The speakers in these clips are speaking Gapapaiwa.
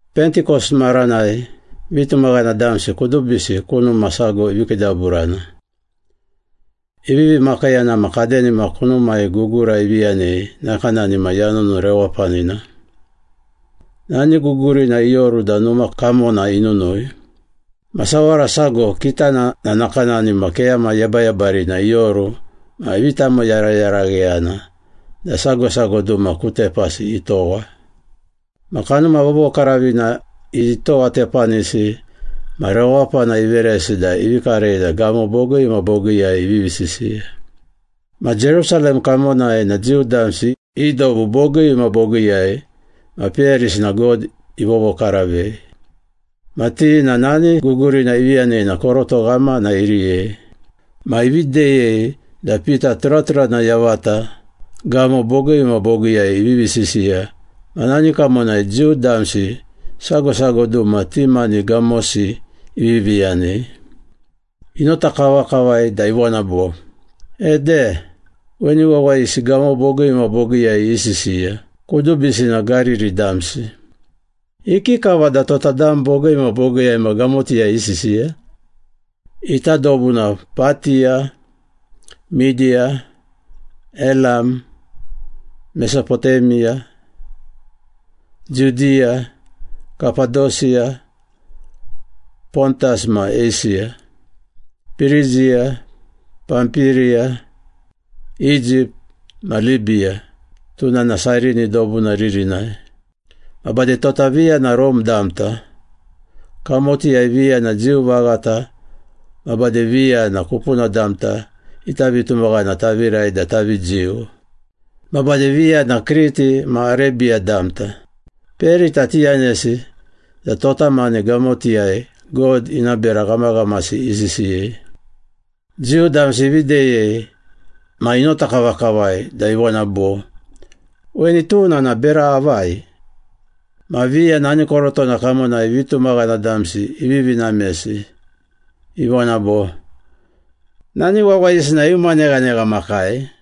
Pentikos maranai vitumaghana damsi kudubisi ku numa sago ivi kiidaburana. Ivivi makiiyana ma kadenima kunumai gugura ivi yanei nakanani ma yanunu rewapanina. Nani gugurina ioru da numa kamona inunui. Ma sawara sago, kitana na nakanani ma keyama yebayebarina ioru ma ivi tamoyarayaragheyana da sago sago duma ku tepasi itowa. Ma Kanuma Vovokaravina itowatepanisi ma rewapana iveresi da ivi karei da gamo bogii ma bogiiyai ivivi sisiya. Ma Jerusalem kamonai na Jiu damsi i dobu bogii ma bogiiyai ma peyarisi na God ivovokaravei. Ma ti na nani gugurina ivi yanei na koroto ghamana iriyei. Ma ivi deyei da Pita turaturana yavata gamo bogii ma bogiiyai ivivi sisiya ma nani kamonai Jiu damsi sago sago duma ti mani gamosi ivivi yanei. Inota kavakavai da ivona bo, “Ede! Weni wawayisi gamo bogii ma bogiiyai isisiya, kudubisi na Gariri damsi. Ikikava da tota dam bogii ma bogiiyai ma gamotiyai isisiya? Ita dobu na Patiya, Midiya, Elam, Mesopotemiya, Judiya, Kapadosiya, Pontas ma Eisiya, Pirigiya, Pampiriya, Egypt ma Libiya, tuna na Sairini dobuna ririnai. Ma bade tota viya na Rome damta, kamotiyai viya na Jiu vaghata, ma bade viya na kupuna damta ita vitumaghana tavirai da tavi Jiu. Ma bade viya na Kriti ma Arebiya damta. Peyarita tiyanesi da tota mani gamotiyai God ina bera ghamaghamasi isisiyei.” Jiu damsi ivi deyei ma inota kavakavai da ivona bo, “Weni tuna na bera avai?” Ma viya nani korotona kamonai vitumaghana damsi ivivi namesi, ivona bo, “Nani wawayisi na iuma neghanegha makai.”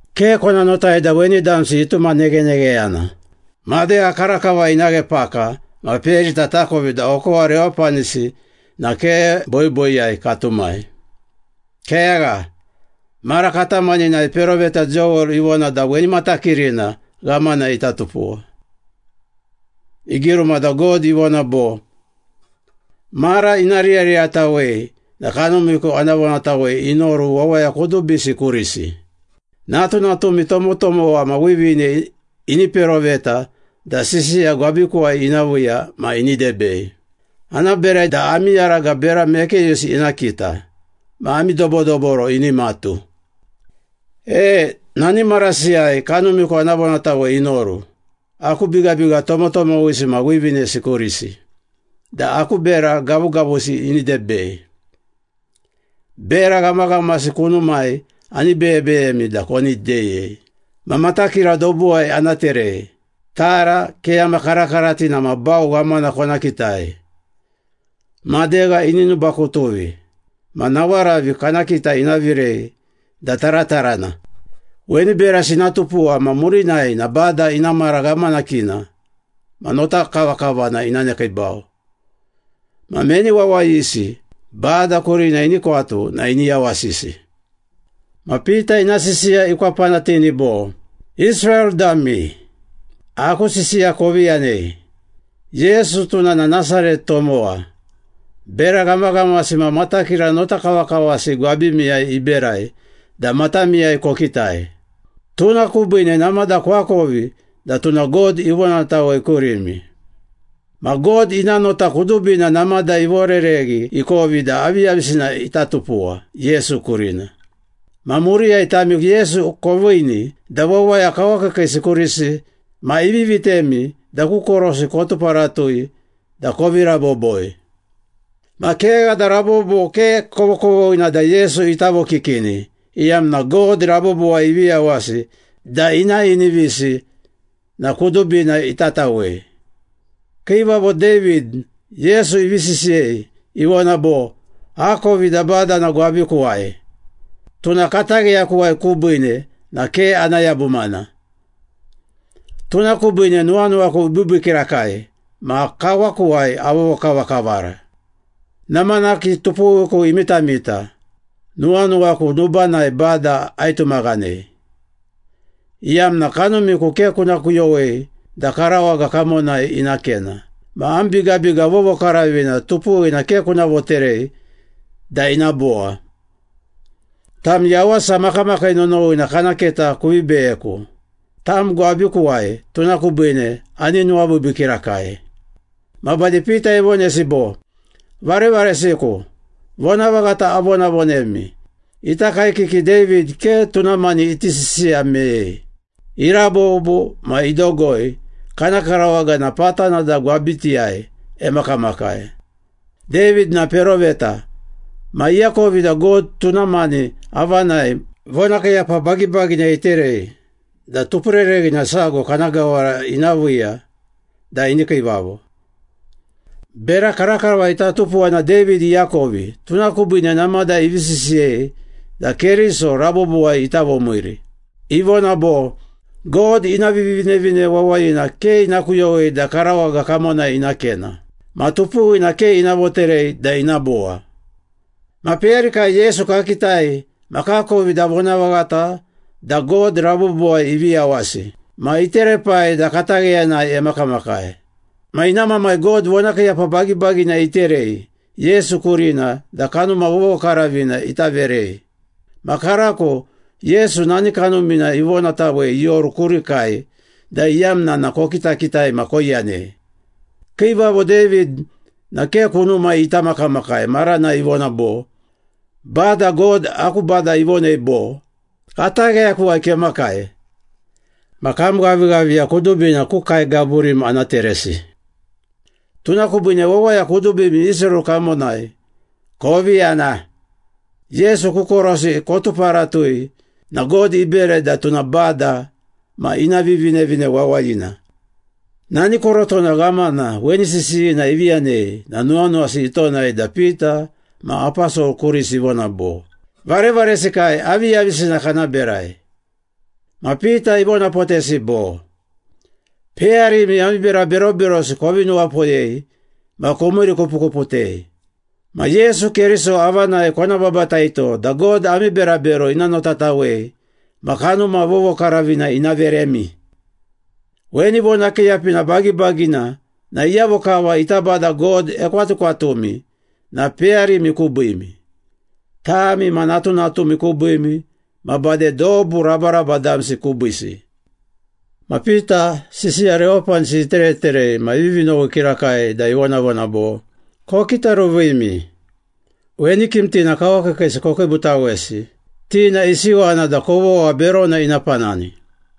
Ke kona notai da weni damsi ituma neghenegheyana. Madegha karakava ina ghe paka, ma peyarita takovi da okowa rewapanisi na ke boiboiyai katumai. Kegha, mara katamaninai peroveta Joel ivona da weni matakirina ghamana ita tupuwa. Igiruma da God ivona bo, ‘Mara ina riyariyatawei na Kanumiku ana vonatawei inoru wawaya kudubisi kurisi. Natunatumi tomotomowa ma wivine ini peroveta da sisiya gwabikuwai ina viiya ma ini debei. Ana berai da ami yaraga bera mekeyusi ina kita, ma ami dobodoboro ini matu. E! Nani marasiyai Kanumiku ana vonatawei inoru aku bigabiga tomotomowisi ma wivinesi kurisi da aku bera gavugavusi ini debei. Bera ghamaghamasi kunumai ani beyebeyemi da koni deyei. Ma matakira dobuwai ana terei. Tara, keyama karakaratina ma bau ghamana kona kitai. Madegha ini nubakutuvi ma nawaravi kana kita ina virei da taratarana. Weni berasi ina tupuwa ma murinai na Bada ina mara ghamanakina ma notakavakavana ina nekiibau. Ma meni wawayisi Bada kurina ini kwatu na ini yawasisi.’” Ma Pita ina sisiya ikwapanatini bo, “Israel dami, aku sisiya kovi yanei! Yesu, tuna na Nasaret tomowa, bera ghamaghamasi ma matakira notakavakavasi gwabimiyai iberai da matamiyai kokitai. Tuna kubiine namada koakovi da tuna God ivonatawei kurimi. Ma God ina nota kudubina namada ivorereghi ikovi da aviyavisina ita tupuwa Yesu kurina. Ma muriyai tami Yesu koviini da wawaya kawakiikiisi kurisi ma ivi vitemi da ku korosi kotuparatui da kovi raboboi. Ma kegha da rabobo ke kovokovoghina da Yesu ita vokikini, iyamna God rabobowai ivi yawasi da ina inivisi na kudubina itatawei. Kiivavo David, Yesu ivi sisiyei, ivona bo, ‘Akovi da Bada na gwabikuwai, Tuna katagheyakuwai kubiine na ke ana yabumana. Tuna kubiine nuwanuwaku ibiibii kirakai ma kawakuwai avovokavakavara. Namanaki tupuwiku imitamita, nuwanuwaku nubanai Bada aitumaghanei, iyamna kanumiku ke kuna kuyowei da karawaga kamonai ina kena, ma am bigabiga vovokaravina tupuwina ke kuna voterei da ina bowa. Tam yawasa makamakii nonowina kana keta kuvi beyeku. Tam gwabikuwai, tuna kubiine ani nuwabiibii kirakai.’” Ma bade Pita ivonesi bo, “Varevaresiku, vonavaghata avonavonemi. Ita kaekiki David ke tuna mani iti sisiya meyei. Irabobo ma idogoi, kana karawaga na patana da gwabitiyai emakamakai. David na peroveta, ma iakovi da God tuna mani avanai vonakiiyapa bagibagina iterei da tupurereghina sago kana gawara ina viiya da ini kiivavo. Bera karakava ita tupuwa na David iakovi, tuna kubiine namada ivi sisiyei da Keriso rabobowai ita vomiiri. Ivona bo, ‘God ina Vivinevine Wawayina ke ina kuyowei da karawaga kamonai ina kena, ma tupuwina ke ina voterei da ina bowa.’” “Ma peyarikai Yesu kakitai ma kakovi da vonavaghata da God rabobowai ivi yawasi ma iterepai da katagheyanai emakamakai. Ma ina Mamai God vonakiiyapa bagibagina iterei Yesu kurina da Kanuma Vovokaravina ita verei. Ma karako Yesu nani Kanumina ivonatawei ioru kurikai da iyamna na kokitakitai ma koiyanei. Kiivavo David na ke kunumai ita makamakai maranai ivona bo, ‘Bada God aku Bada ivonei bo, Katagheyakuwai kemakai, ma kam ghavighaviya kudubina ku kae gaburim ana teresi.’” “Tuna kubiine wawaya kudubimi Israel kamonai, kovi yana. Yesu ku korosi kotuparatui na God iberai da tuna Bada ma ina Vivinevine Wawayina.” Nani korotona ghamana weni sisiyina ivi yanei na nuwanuwasi itonai da Pita ma aposol kurisi ivona bo, “Varevaresikai, aviyavisina kana berai?” Ma Pita ivonapotesi bo, “Peyarimi, ami bera beroberosi kovi nuwapoyei ma komiirikupukuputei. Ma Yesu Keriso avanai kona babataito da God ami berabero ina notatawei ma Kanuma Vovokaravina ina veremi. Weni vonakiiyapina bagibagina na iyavo kava ita Bada God ekwatukwatumi na peyarimi kubiimi, tami ma natunatumi kubiimi ma bade dobu rabaraba damsi kubiisi.” Ma Pita sisiya rewapanisi itereterei ma ivivi nowi kirakai da ivonavona bo, “Kokitaruvimi! Weni kimtina kawakiikiisi kokiibutawesi, ti na isiwana da kovogha berona ina panani.”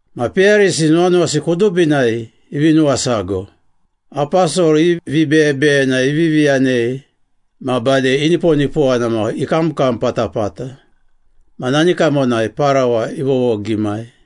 Ma peyarisi nuwanuwasi kudubinai ivi nuwasago, aposol i vibeyebeyena ivivi yanei ma bade iniponipowana ma ikamkam patapata. Ma nani kamonai parawa ivovogimai.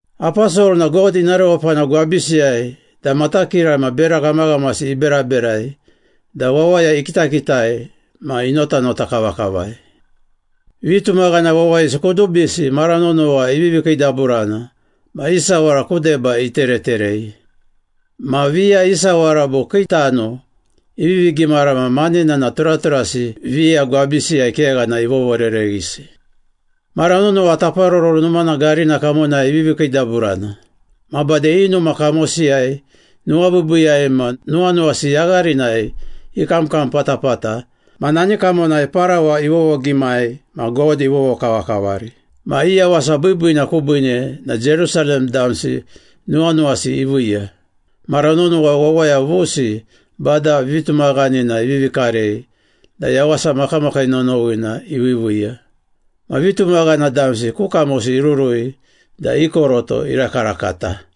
Aposol na God ina rewapana gwabisiyai da matakira ma bera ghamaghamasi iberaberai da wawaya ikitakitai ma inotanota kavakavai. Vitumaghana wawayisi kudubisi mara nonowa ivivi kiidaburana ma i sawara ku deba itereterei. Ma viya i sawara bo kii tano ivivi gimara ma manena na turaturasi viya gwabisiyai kegha na ivovorereghisi. Mara nonowa Taparoro Numana garina kamonai ivivi kiidaburana. Ma bade i numa kamosiyai, nuwabiibiiyai ma nuwanuwasi yagharinai ikamkam patapata ma nani kamonai parawa ivovogimai ma God ivovokavakavari. Ma i yawasa biibiina kubiine na Jerusalem damsi nuwanuwasi iviiya. Mara nonowa wawaya vusi Bada vitumaghanina ivivi karei da yawasa makamakii nonowina iviiviiya. Ma vitumaghana damsi ku kamosi irurui da i koroto irakarakata.